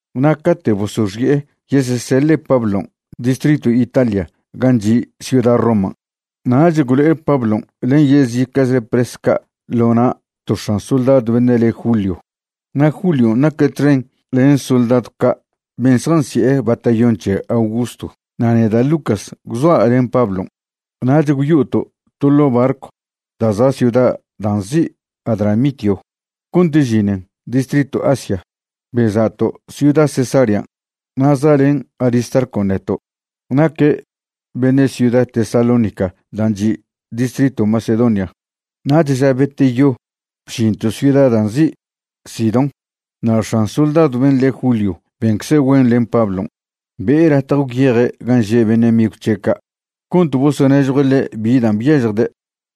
Na' cate' bosoxi'e yeseseḻe' Pablon' distritw Italia gan' chi' ciuda Roman', nach gwlo'e Pablon' len yezica'chle pres ca' ḻo na' to x̱an soldadw beṉe' le Julio. Na' Julion' naque' txen len soldadw ca' ben' zjansi'e Batallón c̱he Augusto. Na' neda' Lucas gwzoa' len Pablon'. Nach gwyo'oto' to ḻo' barcw da' za' ciuda da' nzi' Adramitio cont žinen distritw Asia, beza'to' ciuda Cesarean'. Na' za'len Aristarcon' neto'. Naque' beṉe' ciuda Tesalónica dan' chi' distritw Macedonia. Nach ža beteyo bžinto' ciuda da' nzi' Sidón. Na' x̱an soldadw ben' le' Julio bencze' güen len Pablon', be'e latje gwyeje' gan' že' beṉe' migw c̱he' ca' cont bosonežjue' ḻe' bi dan' byažjde'.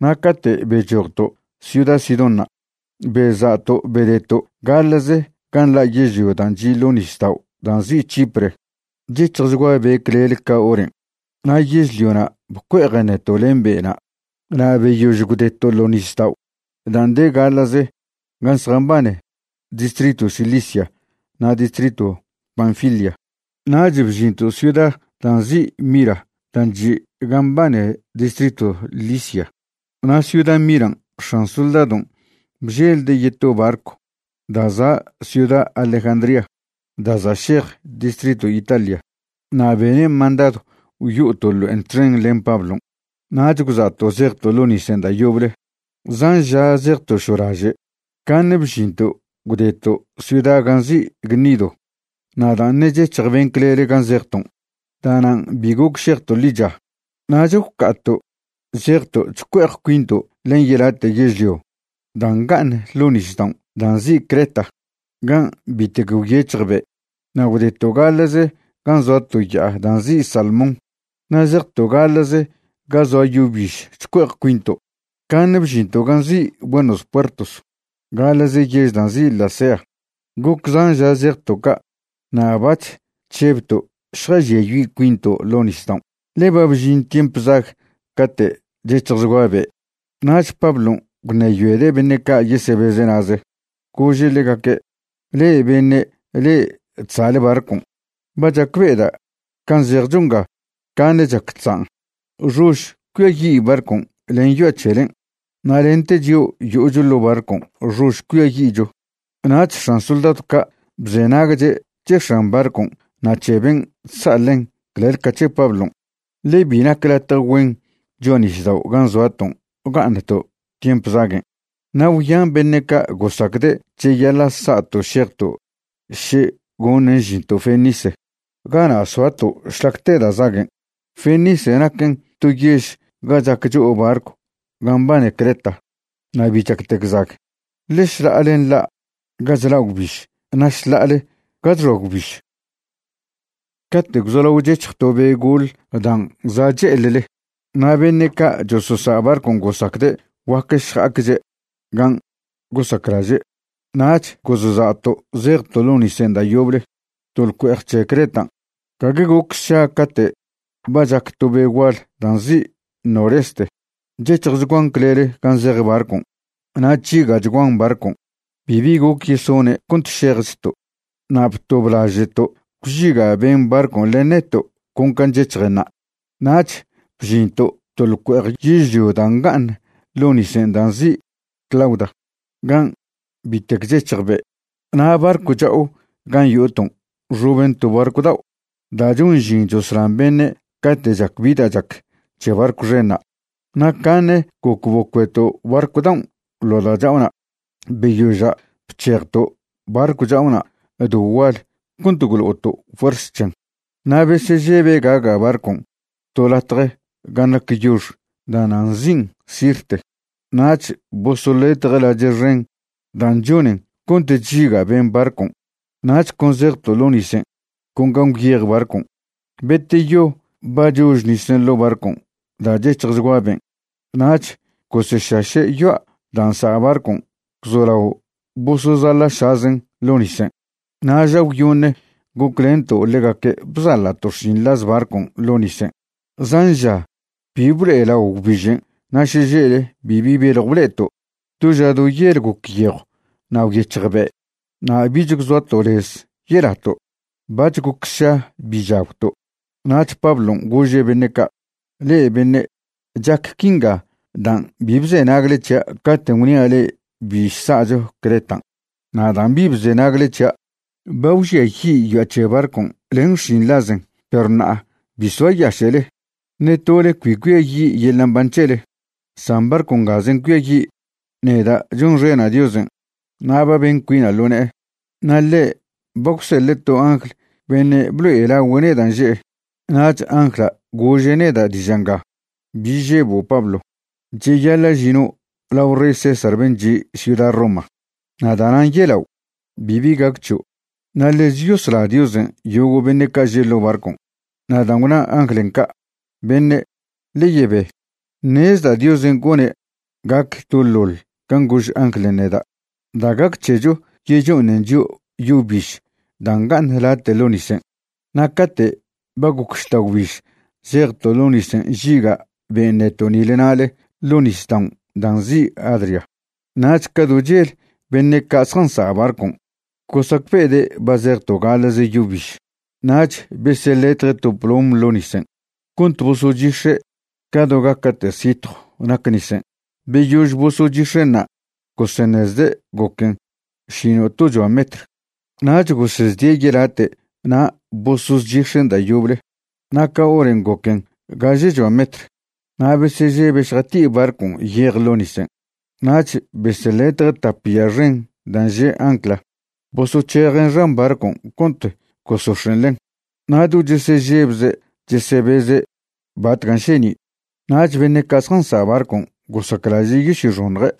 Na' cate' bechojto' ciuda Sidónṉa' beza'to' bedeto' gaḻa'ze gan' nḻa' yežlio dan' chi' ḻo' nisdao' dan' nzi' Chipre. Chec̱hjchgua be' clele ca horen', na' yežliona' bcue'ejen neto' len be'na'. Na' beyož gwdeto' ḻo nisdao' dan' de gaḻa'ze gan' zjambane distritw Cilicia na' distritw Panfilia, nach bžinto' ciuda dan' nzi' Mira dan' chi' gan' mbane distritw Licia. Na' ciuda Miran' x̱an soldadon' bželde' yeto barcw da' za' ciuda Alejandría da' za' šej distritw Italia, na' bene' mandadw gwyo'oto' ḻo'en txen len Pablon'. Nach gwza'to' zejto' ḻo nisen' da' yoble. Zan ža zejto' šolaže', caṉe bžinto' gwdeto' ciuda gan' nzi' Gnido. Na' dan' ṉe' chec̱hj ben' clele gan' zejton', da'nan' bi goc šejto' ḻicha, nach gwca'ato' zejto' chcue'ej cuinto' len yelate' yežlio dan' nga'aṉ ḻo' nisdaon' dan' nzi' Creta, gan' bitec gwyec̱hj be', na' gwdeto' gaḻa'ze gan' zoa to ya'a da' nzi' Salmón. Na' zejto' gaḻa'ze ga zoa yo biž chcue'ej cuinto', caṉe bžinto' gan' nzi' Buenos Puertos gaḻa'ze yež dan' nzi' Lasea. Goc zan ža zejto' ca' na' bac̱h chžebto' šjažiayi' cuinto' ḻo' nisdaon', ḻe ba bžin tiemp zag cate' chec̱hjchgua be'. Nach Pablon' gwṉeyoede' beṉe' ca' yesebeze' na'ze. Gože' ḻegaque': ―Le'e beṉe' le'e chsa'le barcon', ba chacbe'eda' can' zejcho nga caṉe chac chzan', xož cuiayi' barcon' len yoa' c̱helen', na' lente chio' yo'ocho ḻo' barcon' xož cuiayi'cho. Nach x̱an soldadw ca' bzenagche' c̱he x̱an barcon' na' c̱he ben' chsa' ḻen clel ca c̱he Pablon'. Ḻe bi nac latje güen cho'a nisdao' gan' zoaton' ga'aṉto' tiemp zaguen', na' gwyan beṉe' ca' gosacde' cheyaḻa' sa'to' šejto' še goṉen žinto' Fenice gana' soato' šlac te da' zaguen'. Fenice naquen to yež ga chac cho'o barcw gan' mbane Creta na' bi chactec zag, ḻe šḻa'ale nḻa' ga chla' gwbiž na' šḻa'ale ga chxoa gwbiž. Cate' gwzolao chec̱hj to be' goḻ dan' za' che'eḻle na' beṉe' ca' chososa' barcon' gosacde' guac šja'acche' gan' gosaclaže', nach gozsa'to' zejto' ḻo nisen' da' yoble to ḻcue'ej c̱he Cretan'. Gague goc sša cate' ba chac to be' gual da' nzi' Noreste chec̱hjchguan clele gan' zej barcon'. Na' chžiga'chguan barcon'. Bibi goc yesone' cont šejchto'. Na' btoblaže'to' gwžiga' ben' barcon' len neto' con can' chec̱hjenṉa'. Nach bžinto' to ḻcue'ej yežlio da' nga'aṉ ḻo' nisen' dan' nzi' Clauda, gan' bitec chec̱hj be'. Na' barcw cha'o gan' yo'oton' nxoben to barcw dao' da' chon žin choslan beṉe' cate' chac bi da' chac c̱he barcw xenṉa'. Na' caṉe goc bocueto' barcw daon' ḻo' da' cha'ona'. Beyoža' bc̱hejto' barcw cha'ona' do gual cont gwlo'oto' fuers c̱hen. Na' besežebe' gaga' barcon' to latje gan' nac yox da'na' nzi'in Sirte, nach bosoḻetje' lache' xen dan' chonen cont chžiga' ben' barcon'. Nach con zejto' ḻo nisen' con gan' gwyej barcon'. Beteyo ba chož nisen' ḻo' barcon' da' chec̱hjchgua ben', nach gosešaše' yoa' dan' nsa' barcon' gwzolao bosozaḻa'šazen' ḻo' nisen'. Na' ža gwyoṉe goclento' ḻegaque' bzaḻa'to' xšinḻaz barcon' ḻo' nisen'. Zan ža bi blo'elao gwbižen' na' šeže'le bibi beljw ble'eto', do ža do yel goc yejw na' gwyec̱hj be', na' bich gwzoato' lez yelato'. Bac̱h goc sša bi chagwto', nach Pablon' gože' beṉe' ca': ―Le'e beṉe', chac quinga dan' bi bzenagle c̱hia' caten' gwnia' le'e bi sa'cho Cretan', na' dan' bi bzenagle c̱hia', ba gwžiayi' yoa' c̱he barcon' len xšinḻazen. Perw ṉa'a bi soayaše'le, ṉe tole cbi cuiayi' yeḻa' mban c̱hele, san barcw ngazen' cuiayi'. Neda' chonxena' Diosen' na' ba ben cuina' ḻo ne'e, na' ḻe' ba gwseḻe' to angl beṉe' blo'elagüe' neda' nže'e. Nach angla' gože' neda' diža' nga: “Bi žebo' Pablo. Cheyaḻa' žino' lao rey César ben' chi' ciuda Roma, na' da'nan' yelao', bibi gac c̱hio', na' ḻez yosla Diosen' yogo' beṉe' ca' že' ḻo' barcon'.” Na' dan' gwna anglen' ca', beṉe', ḻe yebe. Ṉezda' Diosen' gone' gac doḻoḻ can' gož anglen' neda'. Da' gac c̱hecho yecho'oṉen chio' yo biž da' nga'aṉ late' ḻo' nisen'. Na' cate' ba goc žta'gwbiž zejto' ḻo nisen' nžiga' ben' neto' nile nale ḻo nisdaon' dan' nzi' Adria, nach ca do chel beṉe' ca' zjansa' barcon' gosacbe'ede' ba zejto' gaḻa'ze yo biž. Nach beseḻetje' to plom ḻo' nisen' cont boso'ochix̱e' ca do gaca'te' sitjw nac nisen'. Beyož bosochix̱en'ṉa' goseṉezde' goquen šino'tochoa metr. Nach gosezdie' yelate' na' bosozchix̱en' da' yoble na' ca horen' goquen gažechoa metr. Na' besežebe' šjati'i barcon' yej ḻo' nisen', nach beseḻetje' tap ya xen dan' že' ancla, bosoc̱hejen' xan barcon' cont gosox̱en' ḻen, na' do chesežebze' chesebeze' batcan' šeni'. Nach beṉe' ca' zjansa' barcon' gosaclaže' yosyoxoṉje'.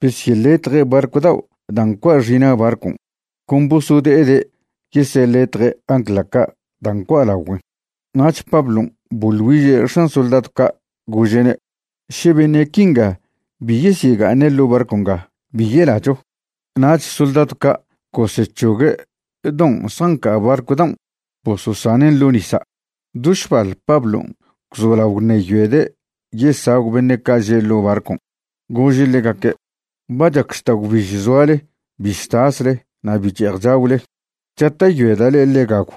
Besyeḻetje' barcw dao' dan' ncua' xina' barcon', con bosode'ede' yeseḻetje' ancla ca' dan' ncua' lagüen'. Nach Pablon' boḻ güiže' x̱an soldadw ca', gože'ne': ―Še beṉe' quinga bi yesyega'aṉe' ḻo' barcw nga, bi yelacho. Nach soldadw ca' gosec̱hogue' don' zjanca' barcw daon' bososanen' ḻo' nisa'. Do šbal Pablon' gwzolao gwṉeyoede' yesagw beṉe' ca' že' ḻo' barcon', gože' ḻegaque': ―Ba chac žta'gwbiž zoale bi chtasle na' bi che'ej chagwle. Chata'yoeda' le'e ḻe gagw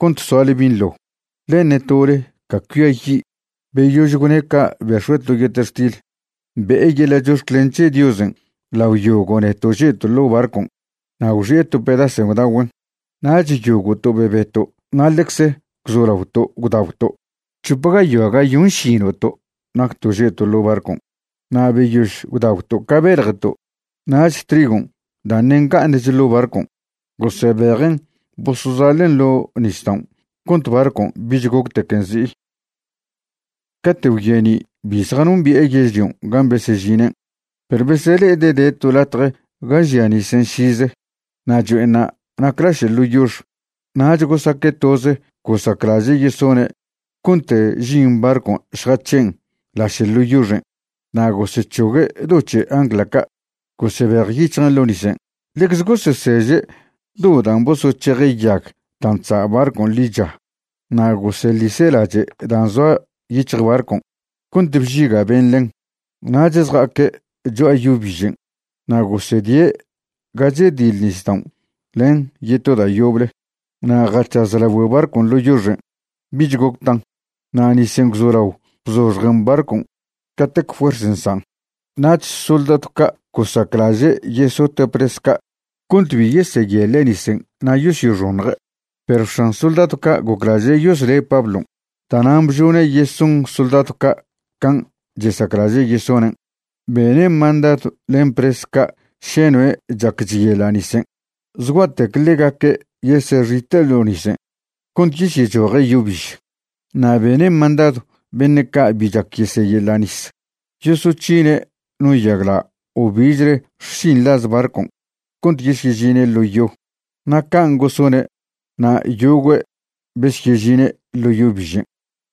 cont soale binḻo, ḻe ṉe tole ca cuiayi'. Beyož gwne' ca' bex̱ue' to yetextil, be'e yeḻa' chox̱clen c̱he Diosen' lao yogo' neto' že'to' ḻo barcon' na' gwxi'e to pedasen' gwdagüen'. Nach yogo'to' bebeto' na' ḻecz gwzolaoto' gwdagwto'. C̱hop gayoa gayonšino'to' nacto' že'to' ḻo' barcon'. Na' beyož gwdagwto' ca beḻjeto', nach trigon' da' ṉe' nga'aṉch ḻo' barcon', gosebejen' bosozaḻen' ḻo' nisdaon' cont barcon' bich goctequen zi'i. Cate' gwyeni' bi zjanombi'e yežlion' gan' besežinen', perw besele'ede' de to latje ga žia nisen' šize na' cho'enṉa' nac laše' ḻo yox. Nach gosaque' toze gosaclaže' yesone' cont žin barcon' šjac̱hen' laše' ḻo yoxen'. Na' gosec̱hogue' do c̱he ancla ca', gosebejyic̱hjen' ḻo' nisen'. Ḻecze goseseže' do dan' bosoc̱heje' yag dan' chsa' barcon' ḻicha na' goseḻise' lache' dan' zoa yic̱hj barcon' cont bžiga' ben' ḻen, nach zja'aque' cho'a yo bižen'. Na' gosedie' ga chediḻ nisdaon' len yeto da' yoble, na' jac̱haz lagüe barcon' ḻo' yoxen', bich goc tan. Na' nisen' gwzolao bzoxjen barcon' catec fuers nsan'. Nach soldadw ca' gosaclaže' yesote' pres ca' cont bi yeseyeḻe' nisen' na' yosyoxoṉje'. Perw x̱an soldadw ca' goclaže' yosle' Pablon', da'nan' bžone' yeson soldadw ca' can' chesaclaže' yesonen'. Bene' mandadw len pres ca' še noe' chac chyeḻa' nisen' zgua'tec ḻegaque' yesexite' ḻo nisen' cont yesyechoje' yo biž. Na' bene' mandadw beṉe' ca' bi chac yeseyeḻa' nis yosoc̱hine' no yagla' o bichle xšinḻaz barcon' cont yesyežine' ḻo yo. Na' can' gosone' na' yogüe' besyežine' ḻo yo bižen'.